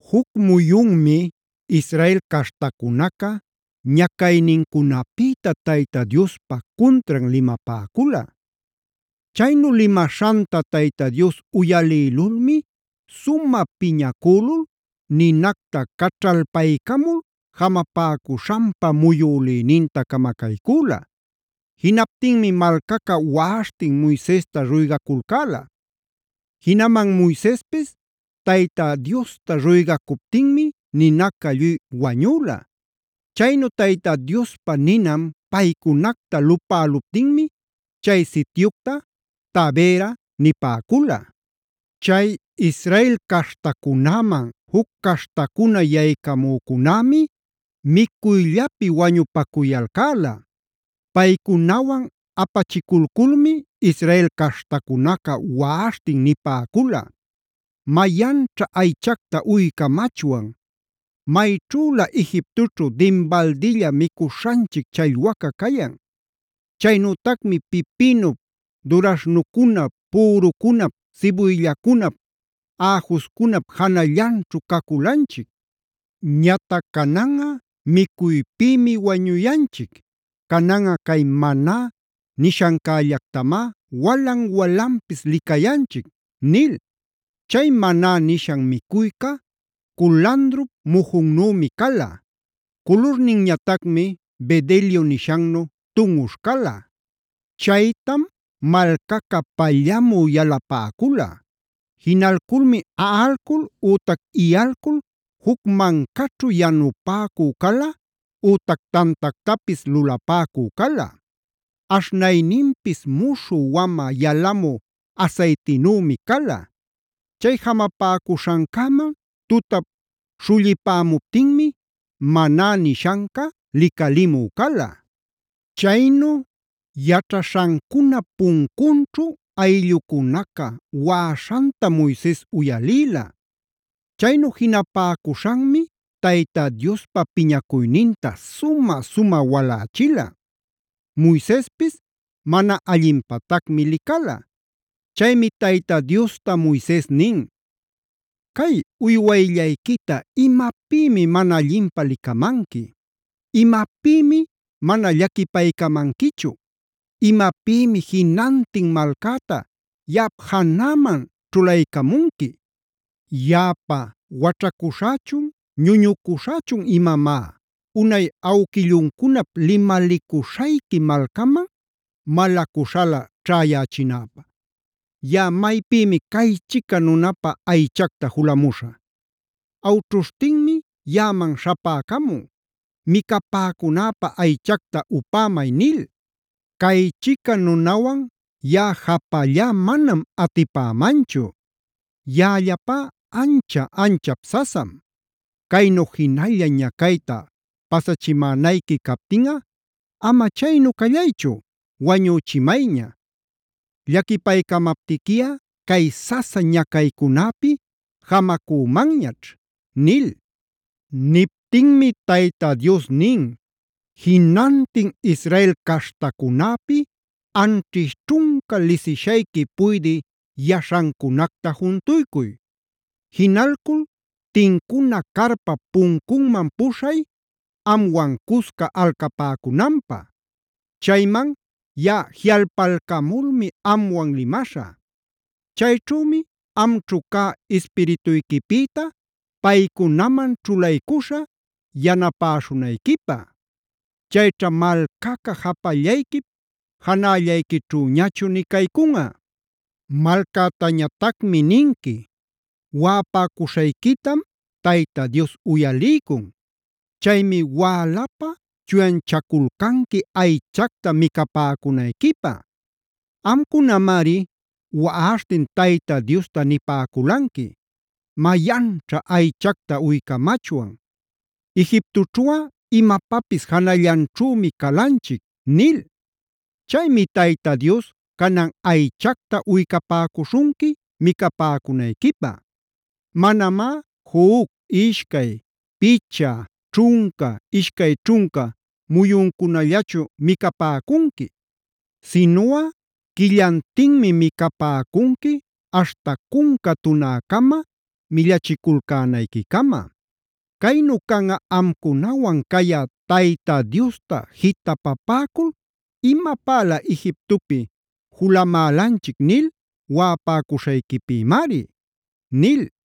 Juc muyunmi Israel caśhtacunaca ñacaynincunapïta Tayta Diospa cuntran limapäcula. Chaynu limaśhanta Tayta Dios uyalïlulmi sumä piñacülul ninacta caćhalpaycamul jamapäcuśhanpa muyülïninta camacaycüla. Jinaptinmi malcaca waꞌaśhtin Moisesta ruygaculcäla. Jinaman Moisespis Tayta Diosta ruygacuptinmi ninaca lluy wañüla. Chaynu Tayta Diospa ninan paycunacta lupäluptinmi chay sityucta Taberaa nipäcula. Chay Israel caśhtacunäman juc caśhtacuna yaycamücunämi micuyllapi wañupacuyalcäla. Paycunawan apachiculculmi Israel caśhtacunaca waꞌashtin nipäcula: “¡Mayanćha aychacta uycamachwan! Mayćhülä Egiptoćhu dinbaldilla micuśhanchic challwaca cayan. Chaynütacmi pipinup, duraśhnucunap, pürucunap, sibuyllacunap, äjuscunap janallanćhu caculanchic. Ñatac cananꞌa micuypïmi wañuyanchic. Cananꞌa cay Maná nishancällactamá walan-walanpis licayanchic” nil. Chay “Maná” nishan micuyca culandrup mujunnümi cala; culurninñatacmi bedelio nishannu tunꞌuśh cala. Chaytam malcaca pallamü yalapäcula. Jinalculmi aꞌalcul ütac iyalcul juc mancaćhu yanupäcü cala ütac tantactapis lulapäcü cala. Aśhnayninpis muśhü wamä yalamü asaytinümi cala. Chay jamapäcuśhancäman tutap śhullipämuptinmi Maná nishanca licalimü cala.b Chaynu yaćhaśhancunap puncunćhu ayllucunaca waꞌaśhantam Moises uyalïla. Chaynu jinapäcuśhanmi Tayta Diospa piñacuyninta sumä-sumä walächila. Moisespis mana allinpatacmi licala. Chaymi Tayta Diosta Moises nin: “¿Cay uywayllayquita imapïmi mana allinpä licamanqui? ¿Imapïmi mana llaquipaycamanquichu? ¿Imapïmi jinantin malcäta yaꞌap janäman ćhulaycämunqui? ¿Yaꞌapa waćhacuśhächun ñuñucuśhächun imamá, unay awquilluncunap limalicuśhayqui malcaman malacuśhalä ćhäyächinäpä? ¿Yaꞌa maypïmi caychica nunapä aychacta julämuśhä? Awćhuśhtinmi yaꞌaman śhapäcamun: ‘Micapäcunäpä aychacta upämay’ nil. Caychica nunawan yaꞌa japallá manam atipämanchu. Yaꞌallapá ancha-anchap sasam. Caynu jinalla ñacayta pasachimänayqui captinꞌa ama chaynu callaychu, wañüchimayña. Llaquipaycamaptiquiꞌa cay sasa ñacaycunäpi jamacümanñaćh” nil. Niptinmi Tayta Dios nin: “Jinantin Israel caśhtacunäpi anćhish ćhunca lisishayqui puydï yaśhancunacta juntuycuy. Jinalcul tincuna carpap puncunman puśhay, amwan cusca alcapäcunanpä. Chayman yaꞌa jiꞌalpalcamulmi amwan limaśhä. Chayćhümi amćhu cä ispirituyquipïta paycunaman ćhulaycuśhä, yanapäśhunayquipä. Chayćha malcaca japallayquip janällayquićhüñachu nï caycunꞌa. “Malcätañatacmi ninqui: Waꞌapäcuśhayquitam Tayta Dios uyaliycun. Chaymi wälapä chuyanchaculcanqui aychacta micapäcunayquipä. Amcunamari waꞌaśhtin Tayta Diosta nipäculanqui: ‘¡Mayanćha aychacta uycamachwan! ¡Egiptoćhuꞌa imapapis janallanćhümi calanchic!’ nil. Chaymi Tayta Dios canan aychacta uycapäcuśhunqui micapäcunayquipä. Manamá juc, ishcay, picha, ćhunca, ishcay ćhunca muyuncunallachu micapäcunqui. Sinuꞌa quillantinmi micapäcunqui aśhta cunca tunäcama, millachiculcänayquicama. Caynu canꞌa amcunawan cayä Tayta Diosta jitapapäcul ‘imapälä Egiptopi yalamulanchic’ nil waꞌapäcuśhayquipïmari” nil.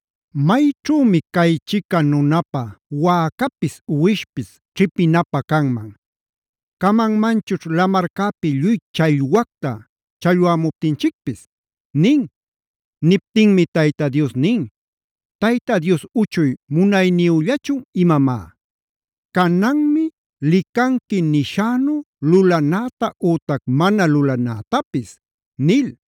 ¿Mayćhümi chaychica nunapä wäcapis, uwishpis ćhipinapä canman? ¿Camanmanchućh lamarcäpi lluy challwacta challwämuptinchicpis?” nin. Niptinmi Tayta Dios nin: “¿Tayta Dios uchuy munayniyüllachun imamá? Cananmi licanqui nishänu lulanäta ütac mana lulanätapis” nil.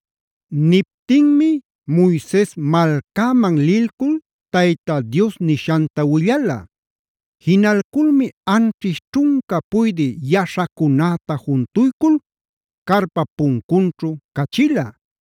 Niptinmi Moises malcäman lilcul Tayta Dios nishanta willala. Jinalculmi anćhish ćhunca puydï yaśhacunäta juntuycul carpap puncunćhu cachila.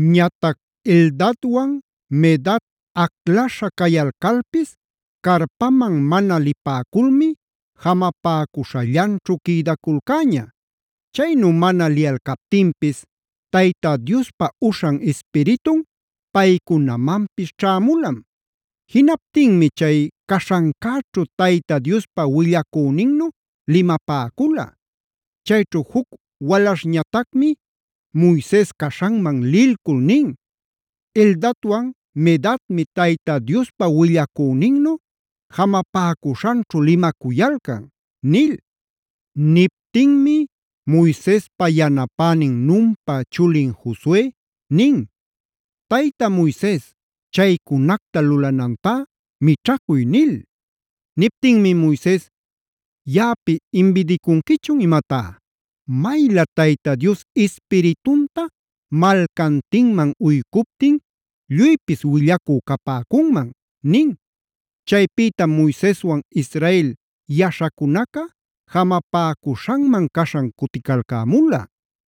Ñatac Eldadwan Medad aclaśha cayalcalpis carpaman mana lipäculmi jamapäcuśhallanćhu quïdaculcäña. Chaynu mana liyalcaptinpis Tayta Diospa uśhan ispiritun paycunamanpis ćhämulam. Jinaptinmi chay caśhancäćhu Diospa willacüninnu limapäcula. Chayćhu juc walaśhñatacmi Moises caśhanman lilcul nin: “Eldadwan Medadmi Tayta Diospa willacüninnu jamapäcuśhanćhu limacuyalcan” nil. Niptinmi Moisespa yanapänin Nunpa chulin Josue nin: “Tayta Moises chaycunacta lulanantá mićhacuy” nil. Niptinmi Moises: “¿Yaꞌapi imbidicunquichun imatá? Maylä Tayta Dios ispiritunta malcantinman uycuptin lluypis willacü capäcunman” nin. Chaypïtam Moiseswan Israel yaśhacunaca jamapäcuśhanman caśhan cuticalcämula.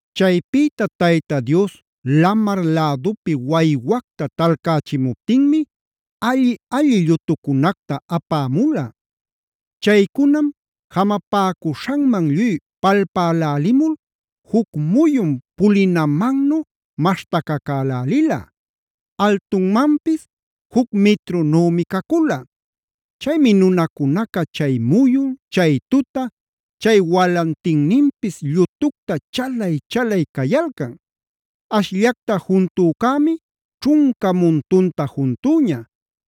Chaypïta Tayta Dios lamar lädupi waywacta talcächimuptinmi alli-alli llutucunactac apämula. Chaycunam jamapäcuśhanman lluy palpälälimul juc muyun pulinamannu maśhtacacälälila, altunmanpis juc mitrunümi cacula. Chaymi nunacunaca chay muyun, chay tuta, chay walantinninpis llutucta chalay-chalay cayalcan. Ashllacta juntücämi ćhunca muntunta juntüña.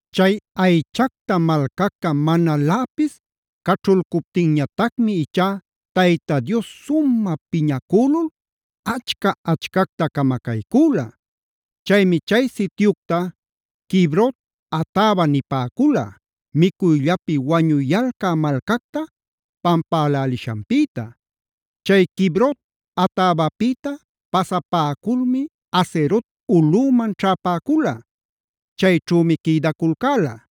Chay aychacta malcaca manaläpis caćhulcuptinñatacmi ichá Tayta Dios sumä piñacülul achca-achcacta camacaycüla. Chaymi chay sityucta “Kibrot-hataava”e nipäcula, micuyllapi wañuyalca malcacta pampälälishanpïta. Chay Kibrot-hataavapïta pasapäculmi Hazerot ulꞌüman ćhäpäcula. Chayćhümi quïdaculcäla.